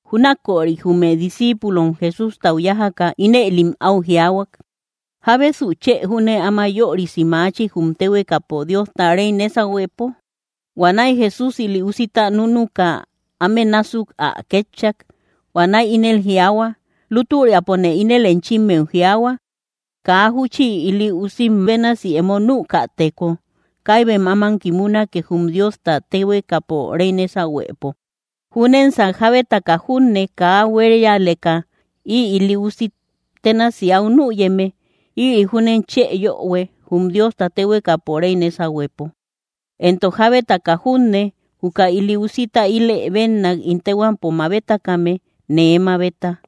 Júnaköri jume discíipulom Jesústau yájaka, ínëlim áu jiaahua: —¿Jábesu chë júne áma yörisi machi, jum téhuekapo Diosta réy nésahuepo? Huanäi Jesús ili usita núnuka, áme násuk ä kétchak. Huanäi ínel jiaahua: —Lútüriapone ínel enchimmeu jiaahua, kaa júchi ili usim bénasi emo nükateko kaibem aman kimunake jum Diosta téhuekapo réy nésahuepo. Júnensan jábetaka junne kaa áu buérialeka ï ili usi ténasi áu nüyeme, ïri júnen chë yöhue jum Diosta téhuekapo réy nésahuepo. Entok jábetaka junne, juka ili usita ilë bénnak ín téhuampo mabetakame, nee mabeta.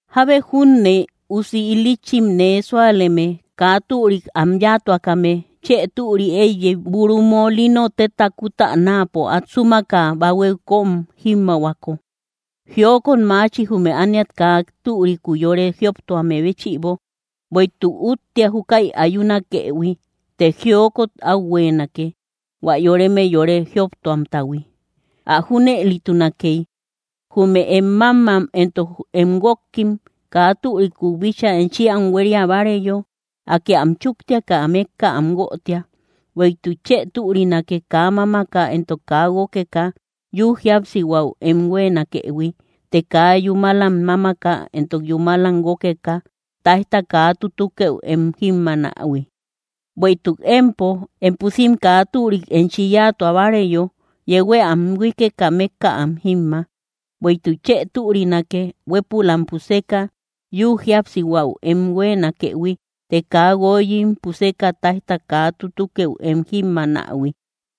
’Jábe junne usi il‑lïchim nee súaleme, kaa türik am yáatuakame, chë türi éiyey, buru molino tétata kutänaapo át súmaka bahuéu kóm jímmaahuako. ¡Jiokot maachi, jume ániat kaa türikuu yore jioptuame béchïbo! Bueïtuk úttia júkäi ayunakëhui, të ¡Jiokot áu huéenake, hua yoreme yore jioptuamtahui! ’Ä junëlitunakey, jume em mámam entok em guókim kaa türikum bíchaa enchi am huéria báareyo, Akë am chúktiaka mékka am guötia. Bueïtuk chë türinake, kaa mámaka entok kaa guókeka yü jíapsihuäu em huéenakëhui, të kaa yúmalam mámaka entok yúmalam guókeka táijta kaa tutukëu em jímmaanähui. Bueïtuk empo, em pusim kaa türik enchi yáatua báareyo, yeuhuë am huíkeka mékka am jímma. Bueïtuk chë türinake, huépülam puseka yü jíapsihuäu em huéenakëhui, të kaa guoyim puseka táijta kaa tutukëu em jímmaanähui.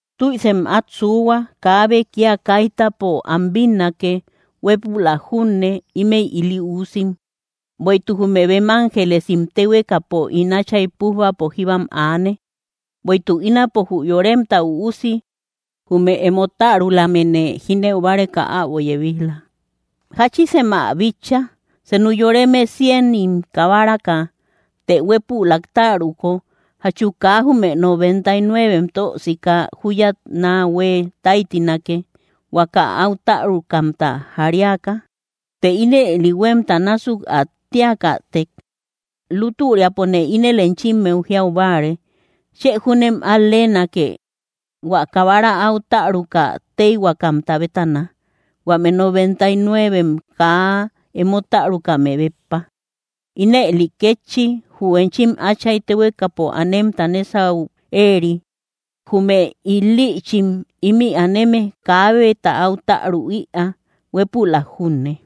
’¡Tüisem át suuhua! Kaabe kía kaitapo am bínnake, huépülak junne, ímëi ili uusim. Bueïtuk jume bem ángelesim téhuekapo ín Áchay pújbapo jíbam aane. Bueïtuk ínapo jü Yoremta Üusi jume emo tärulamene jínëu báreka äbo yebij‑la. ’¿Jáchisem ä bitcha? Senu yoreme cienim kabaraka, të huépülak täruko, ¿jachu kaa jume noventa y nuevem tösika júyat náa huée táytinake, huaka áu tärukamta jariaka? Të ínëli huémta násuk ä tíakätek, lútüriapone ínel enchimmeu jiau báare, chë júne al-leenake, hua kabara áu täruka tëihuakamta bétana, huame noventa y nuevem kaa emo tärukame béppa. Ínëli kétchi, jü enchim áchay téhuekapo anemta nésau éeri, jume il‑lïchim ímï aneme, kaabeta áu täru ïaa, huépülak junne.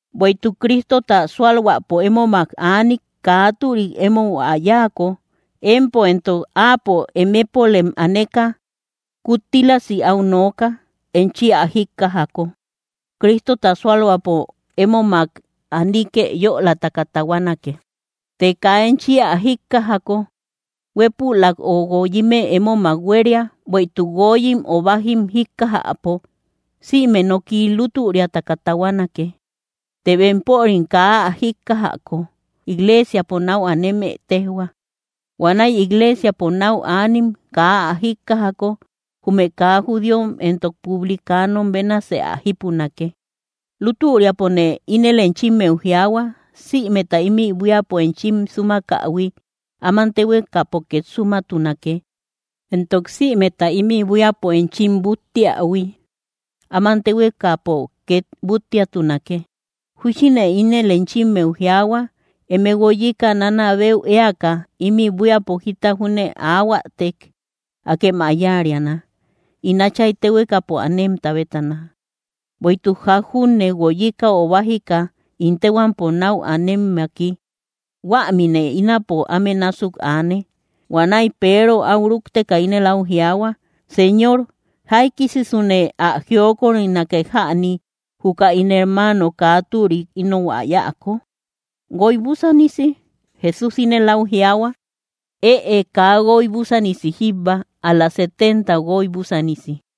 ’Bueïtuk Cristota súalhuäpo émomak aanik, kaa türik émou ä yáako, empo éntok áapo emepolem aneka, kuttilasë áu nooka. Enchi ä jíkkajako, Cristota súalhuäpo émomak anikë yölataka tahuanake. Të kaa enchi ä jíkkajako, huépülak ö guoyimë émomak huéria; bueïtuk guoyim ö bájim jíkkajäpo sïme noki lútüriataka tahuanake. Të bempörim kaa ä jíkkajako, igleesiapo náu aneme téjhua. Huanäi igleesiapo náu anim kaa ä jíkkajako, jume kaa judíom entok publicanom bénasë ä jípunake. ’Lútüriapone ínel enchimmeu jiaahua, sïmeta ímï buíapo enchim súmakähui, áman téhuekapo két súmatunake, entok sïmeta ímï buíapo enchim búttiähui, áman téhuekapo két búttiatunake. ’Júchine ínel enchimmeu jiaahua, eme guoyika, nanabeu éaka, ímï buíapo jita júne aahuätek, akem ä yáariana, ín Áchay téhuekapo anemta bétana. Bueïtuk ják junne, guoyika ö bájika ín téhuampo náu anemmaki, huämine ínapo áme násuk aane. Huanäi Peero áu rúkteka ínel áu jiaahua: —Señor, ¿jaikisisune ä jiokorinake jäni, juka ín hermaano kaa türik inou ä yáako? ¿Guoy búsanisi? Jesús ínel áu jiaahua: —Ëe; kaa guoy búsanisi jíbba, ál‑la setenta guoy búsanisi.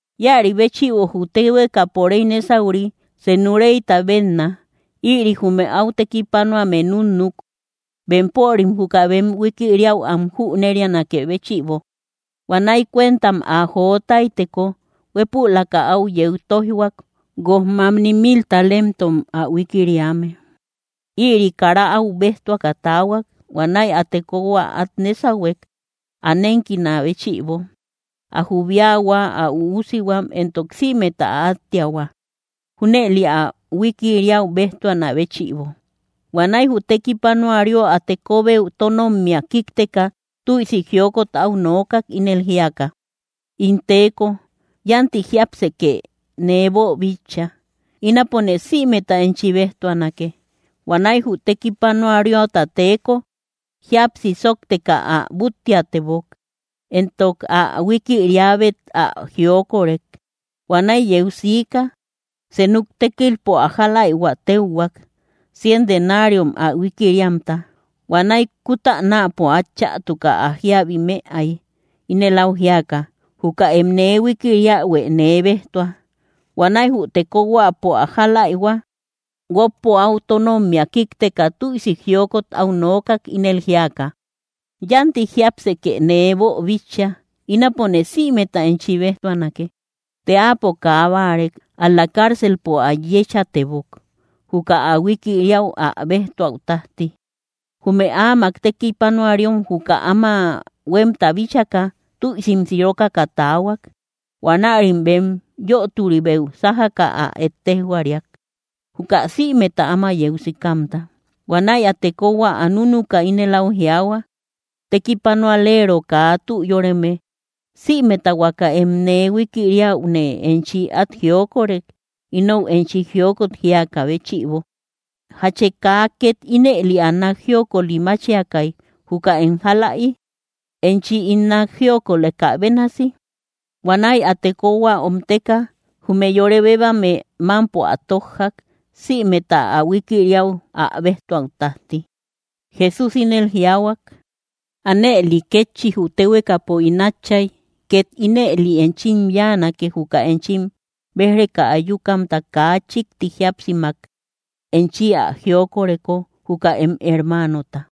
’Ïäri béchïbo jü téhuekapo réy nésauri senu réyta bénna. Ïri jume áu tékipanoame núnnuk, bempörim juka bem huikiriäu am jünerianakë béchïbo. Huanäi cuentam ä jo táyteko, huépülaka áu yeu tóijhuak, guoj mamni mil talentom ä huikiriame. Ïri kara áu béjtuaka taahuak. Huanäi ä tekohua át nésahuek ä nénkinä béchïbo, ä jubiahua, ä üusihuam, entok sïmeta ä áttiahua, junëli ä huikiriäu béjtuanä béchïbo. Huanäi jü tekipanuario ä tekobeu tónommia kíkteka, tüisi jiokot áu nookak, ínel jíaka: “In teeko, yánti jiápsekë nee boobíchaïhui. Ínapone sïmeta enchi béjtuanake.” Huanäi jü tekipanuariota teeko, jíapsi sóokteka ä búttiatebok, entok ä huikiriäbet ä jiokorek. Huanaï yeu sika, senuk tékilpo ä jáläihua téuhuak, cien denariom ä huikiriamta. Huanäi kutänapo át chätuka ä jíabi mëay, ínel áu jíaka: “¡Juka em nee huikiriähuë nee bejtua!” Huanäi jü tekohuäpo ä jáläihua, guókpo áu tónommia kíkteka, tüisi jiokot áu nookak, ínel jíaka: “Yánti jiápsekë nee boobíchaïhui. Ínapone sïmeta enchi béjtuanake.” Të áapo kaa báarek, ál‑la carcelpo ä yéchatebok, juka ä huikiriäu ä béjtuäu tájti. Jume áamak tekipanuariom juka áma huémta bíchaka, tüisim sirokaka taahuak. Huanärim bem yöturibeu sájaka ä ettejhuariak, juka sïmeta áma yeu sikamta. Huanäi ä tekohua ä núnuka, ínel áu jiaahua: “¡Tekipanoalero kaa tü yóreme! Sïmeta huaka em nee huikiriäune enchi át jiokorek, inou enchi jiokot jíakä béchïbo. ¿Jachë kaa két ínëli ä nák jiokoli máchiakay, juka em jálaï, enchi ín nák jiokolekä bénasi?” Huanäi ä tekohua omteka, jume yore bébebame mámpo ä tójjak, sïmeta ä huikiriäu ä béjtuäu tájti. Jesús ínëli jiaahuak: —Ánëli kétchi, jü téhuekapo ín Átchay két ínëli enchim yáanake, juka enchim béj‑reka ayukamta kaa chíkti jíapsimak enchim ä jioköreko juka em hermanota.